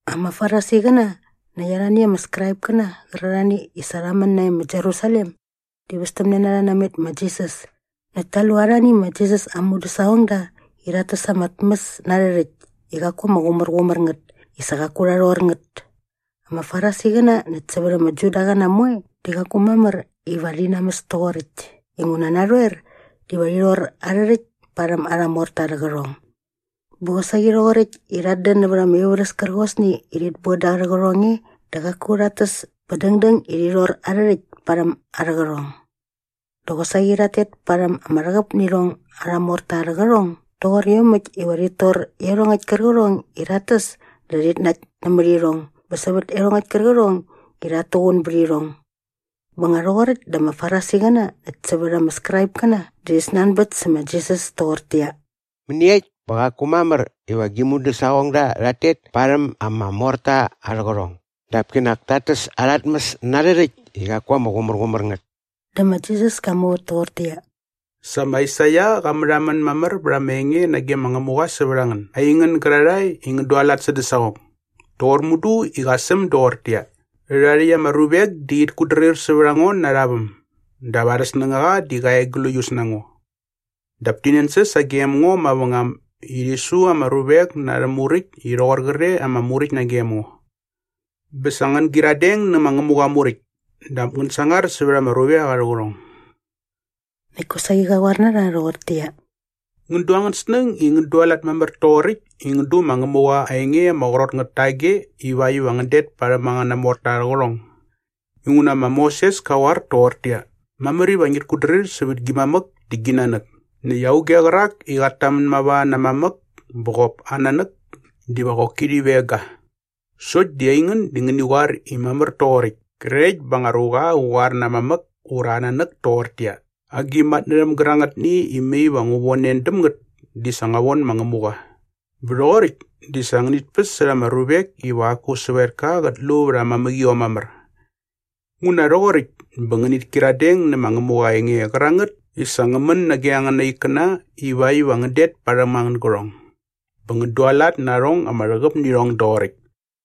Ama Farisiqäna näkt arhani ama Skraipkäna qärarhani i sa rha män nae ma Jerusalem di västämne na rha namet ma Jisas näkt ta lu arhani ma Jisas aa mudäsaqongda i rhat täs ama tmäs na arhä rhäkt i qaku ama qumärqumär ngät i sa qaku rha rhor ngät. Ama Farisiqäna näkt sävät ama Judaqäna moe di qaku mamär iva rhi namäs toqoräkt inguna narhoer diva rhi rhor arhä rhäkt parhäm arha morta arhä qärhong. Bä qosaqi rhoqoräkt i rhat dän nävät ama ivärhäs kärqosni i rhit boda arhä qärhong e dä qaku rhat täs bä dängdäng i rhi rhor arhä rhäkt parhäm arhä qärhong. Dä qosaqi rhat tet parhäm ama rhäqäp nä irhong arha morta arhä qärhong doqor iomäkt iva rhit tor iarhongäkt kärqärhong i rhat täs dä rhit nakt nämät irhong bä sävät iarhongäkt kärqärhong i rhat tuqun bät irhong. Bä nga rhoqoräkt dä ama Farisiqäna näkt sävät ama Skraipkäna rhi snanbät sä ma Jisas toqortäqyia, “Mäniekt bä qaku mamär iva gi mudäsaqongda rhat tet parhäm ama morta arhä qärhong dap kinak tat täs arha tmäs na arhä rhäkt i qaku ama qumärqumär ngät?” Dä ma Jisas ka muvät toqortäqyia, “Sa ma Aisaia qa märhamän mamär bät ama enge nage ma Ngämuqa sävät a ngän, aingän gärarhae i ngän dualat sädä saqong, toqor mudu i qa säm doqortäqyia, “‘Rhärhae rhäkt ama ruvek di rhit kutdrir sävät a ngo na arha väm dap arhä snängaqa di qa e gläius na ngo. Dap ti nänsäs sagem ngo mavängam i rhi su ama ruvek na arhä muräkt i rhoqor qre ama muräkt nagem ngo.’ Bä sa ngän gyiradeng nä ma Ngämuqa aa Muräkt dap ngän sangar sävät ama ruvek arhä qärhong.” Näkt kosaqi qa qoar na rha rhoqortäqyia, “Ngän du angän snäng i ngän dualat mamär toqoräkt i ngän du ma Ngämuqa aa enge ama qrot ngät tage ivakt iva ngän det parhäm angäna morta arhä qärhong! Inguna ma Moses ka qoar toqortäqyia, ‘Mamär iva ngit kutdrir sävät gi mamäk dä gi nanäk’ näkt ‘Auge qärak i qät tamän mava na aa mamäk bä qop aa nanäk diva qoki rhi veng ga.’ Sokt di aingän di ngäni qoar i mamär toqoräkt krekt bä nga anga ruqa qä qoar na aa mamäk ura aa nanäk toqortäqyia, ‘Agi matnärhäm gärangätni i mai va ngu von en däm ngät di sa ngua von ma Ngämuqa’ bä rhoqoräkt di sa ngänit päs särha ama ruvek iva qaku sävetka qät lu vät aa mamäqiom mamär. Nguna rhoqoräkt bä ngänit kyiradeng nä ma Ngämuqa aa enge qärangät i sa ngä män nage angäna ikkäna ivakt iva ngän det parhäm angän gärhong. Bä ngän dualat na arhong ama rhäqäp nä irhong doqoräkt.”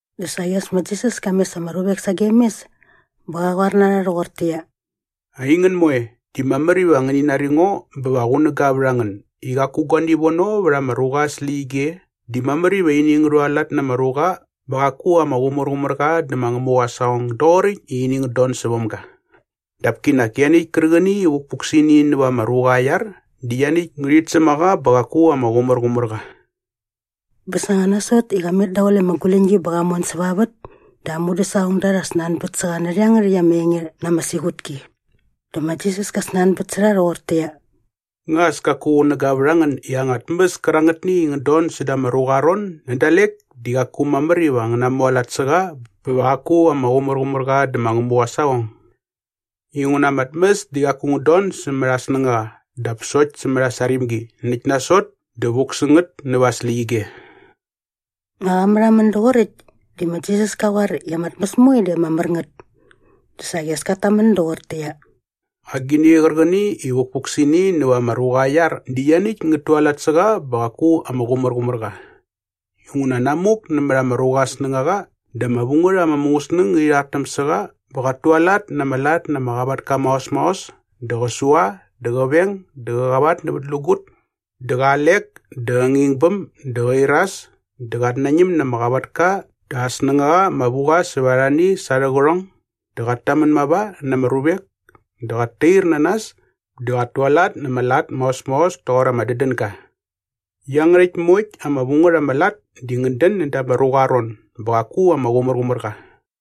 Dä saqi as ma Jisas ka mes ama ruvek sagem mes bä qa qoar na rha rhoqortäqyia, “Aingän moe, di mamär iva ngäni nari ngo bä va qunäga vät a ngän i qaku guani vono vät ama ruqa aa släqyige di mamär iva ini ngä rhualat na ama ruqa bä qaku ama qumärqumär qa dä ma Ngämuqa aa saqong doqoräkt i ini ngät don säväm ga. Dap kinak ianiäkt kärqäni i vukpuk sä ini näva ama ruqa aa iar di ianiäkt ngärhit säm a qa bä qaku ama qumärqumär qa.” Bä sa nga nasot i qa met daqule ama guläñgi bä qa mon säva aa vät dä aa mudäsaqongda rha snanbät sä qa närhä iangärhäkt ama enge na ama siqutki. Dä ma Jisas ka snanbät sä rha rhoqortäqyia, “Nga as kaku qunäga vät a ngän i anga tmäs kärangätni i ngät don säda ama ruqa aa ron nä dalek di qaku mamär iva ngä namualat na qa bä va qaku ama qumärqumär qa dä ma Ngämuqa aa saqong? Inguna ama tmäs di qaku ngät don sämät aa snängaqa dap sokt sämät aa sarimgi näkt nasot dä vuk sä ngät näva aa släqyige.” Nga qa märhamän doqoräkt di ma Jisas ka qoar i ama tmäs moe di ama mär ngät. Dä saqi as kat tamän doqortäqyia, “Agini qärqäni i vukpuk sä ini näva ama ruqa aa iar di ianiäkt ngät tualat sä qa bä qaku ama qumärqumär qa.” Inguna namuk nämät ama ruqa aa snängaqa dä ama vu ngät ama mungäsnäng ngärhi rhartäm sä qa bä qat tualat na ama lat na ama qavatka maos maos dä qä sua dä qä veng dä qä qavatnävätlägut dä qä alek dä qä ngingbäm dä qä iras dä qat nañäm na ama qavatka dä aa snängaqa ama vu qa sävät arhani sa arhä qärhong dä qat tamän mava na ama ruvek dä qat tair na nas dä qat tualat na ama lat maos maos toqor ama dädänga. Iangärhäkt moekt ama vu ngät ama lat di ngät dän näda ama ruqa aa ron bä qaku ama qumärqumär qa.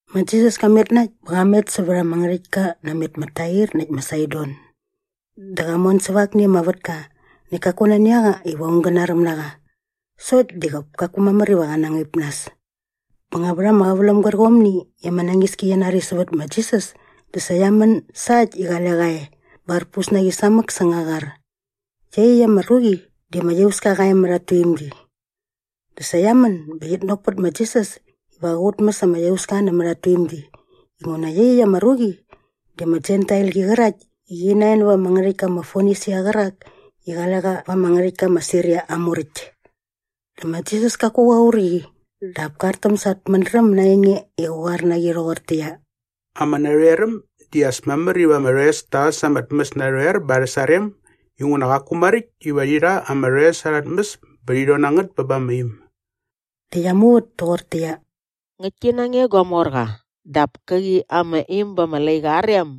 Ma Jisas ka met na äkt bä qa met sävät ama ngärhäktka namet ma Tair näkt ma Saidon. Dä qa mon säva akni ama vätka näkt kaku nani a qa iva aung gä naräm na qa. Sokt di qop kaku mamär iva qä ngaip nas. Bä nga vät ama qäväläm gärqomni i ama nañiski qia nari sävät ma Jisas di sa qia män sa äkt i qale qa e bä arpus na qi samäk säng aa qar. Iaqyäkt ama ruqi di ama iauska qa e mät at tuimgi. Dä sa qia män bä qit nok pät ma Jisas iva qä qutmäs ama iauska nämät at tuimgi inguna iaqyäkt ama ruqi di ama Jentailqi qärakt i qi nae näva ama ngärhäktka ma Fonisia qärak i qale qa va ama ngärhäktka ma Siria aa muräkt. Dä ma Jisas kaku qa qur qi dap ka artäm sa at mädräm na aa enge i qä qoar na qi rhoqortäqyia, “Ama narhoeräm di as mamär iva ama rhoes ta äs ama tmäs narhoer bä arhä sarem inguna qaku maräkt iva rhi rha ama rhoes arha tmäs bä rhi rhon na ngät bä ba ama im.” Dä qia muvät toqortäqyia, “Ngäktki na nge gua morqa, dap käqi ama im ba ama laiqa aa rem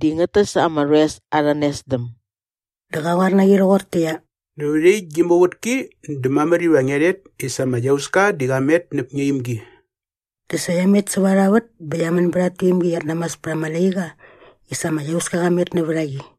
di ngät täs ama rhoes arha nesdäm.” Dä qa qoar na qi rhoqortäqyia, “Nävät iaqyäkt gi muvätki dä mamär iva ngia rhet i sa ama iauska di qa met näp ngia imgi.” Dä sa qia met säva arha vät bä qia män bät at tuimgi i qiat namas pät at laiqa i sa ama iauska qa met nävät a qi.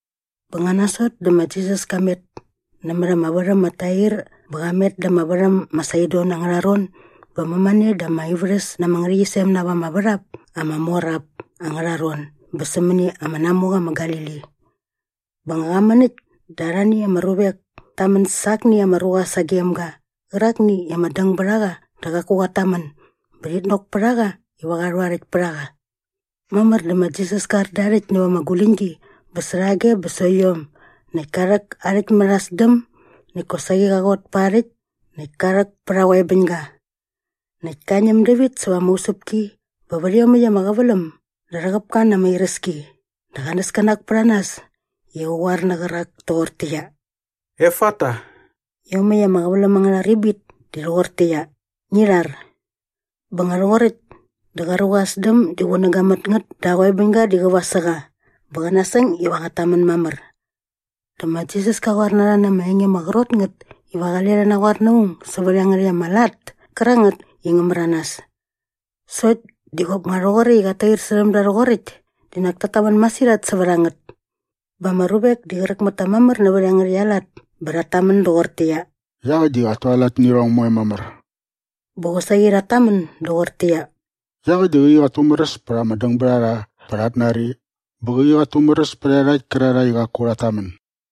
Bä nga nasot dä ma Jisas ka met nämät ama värhäm ma Tair bä qa met da ama värhäm ma Saidon angärha ron bä mämane da ama ivärhäs na ama ngärhäqyisem na ap ama värhap ama mor ap angärha ron bä sämäni ama namuqa ma Galili. Bä nga qa män äkt dä arhani ama ruvek ta män sa akni ama ruqa sagem ga qärakni i ama däng bät a qa dä qaku qat tamän bä rhit nok pät a qa iva qa rhu aa rhäkt pät a qa. Mamär dä ma Jisas ka ar da aa rhäkt näva ama guläñgi bä särhage bä sokt iom näkt ka rhäk aa rhäkt mät aa sdäm näkt kosaqi qa qot pa aa rhäkt näkt ka rhäk pät aa qoebäñga. Näkt ka ñäm dävit säva ama usäpki bä vät iomäkt ama qäväläm dä rhäqäp ka na ama iräski dä qa näskänak pät a nas i qa qoar nä qärak toqortäqyia, “Efata!” Iomäkt ama qäväläm angärha ribit di rhoqortäqyia, “Ngi rhar!” Bä nga rhoqoräkt dä qa ruqa aa sdäm di qunäga mät ngät dä aa qoebäñga di qäva sä qa bä qa nasäng iva qat tamän mamär. Dä ma Jisas ka qoar na rha na ama enge ama qrot ngät iva qale rhi naqoar na aung sävät iangärhäkt ama lat kärangät i ngä märanas. Sokt di qop nga rhoqoräkt i qat tair särhäm da rhoqoräkt di nak tat tamän masirhat sävät a ngät. Bä ama ruvek di qräk mät ta mamär nävät iangärhäkt aa lat bä rhat tamän doqortäqyia, “Iaqäkt di qat tualat nä irhong moe mamär.” Bä qosaqi rhat tamän doqortäqyia, “Iaqäkt di qäqi qat tumäräs pät ama dängbärharha bä rhat nari bä qäqi qat tumäräs pät iarhakt kärarhae i qaku rhat tamän.”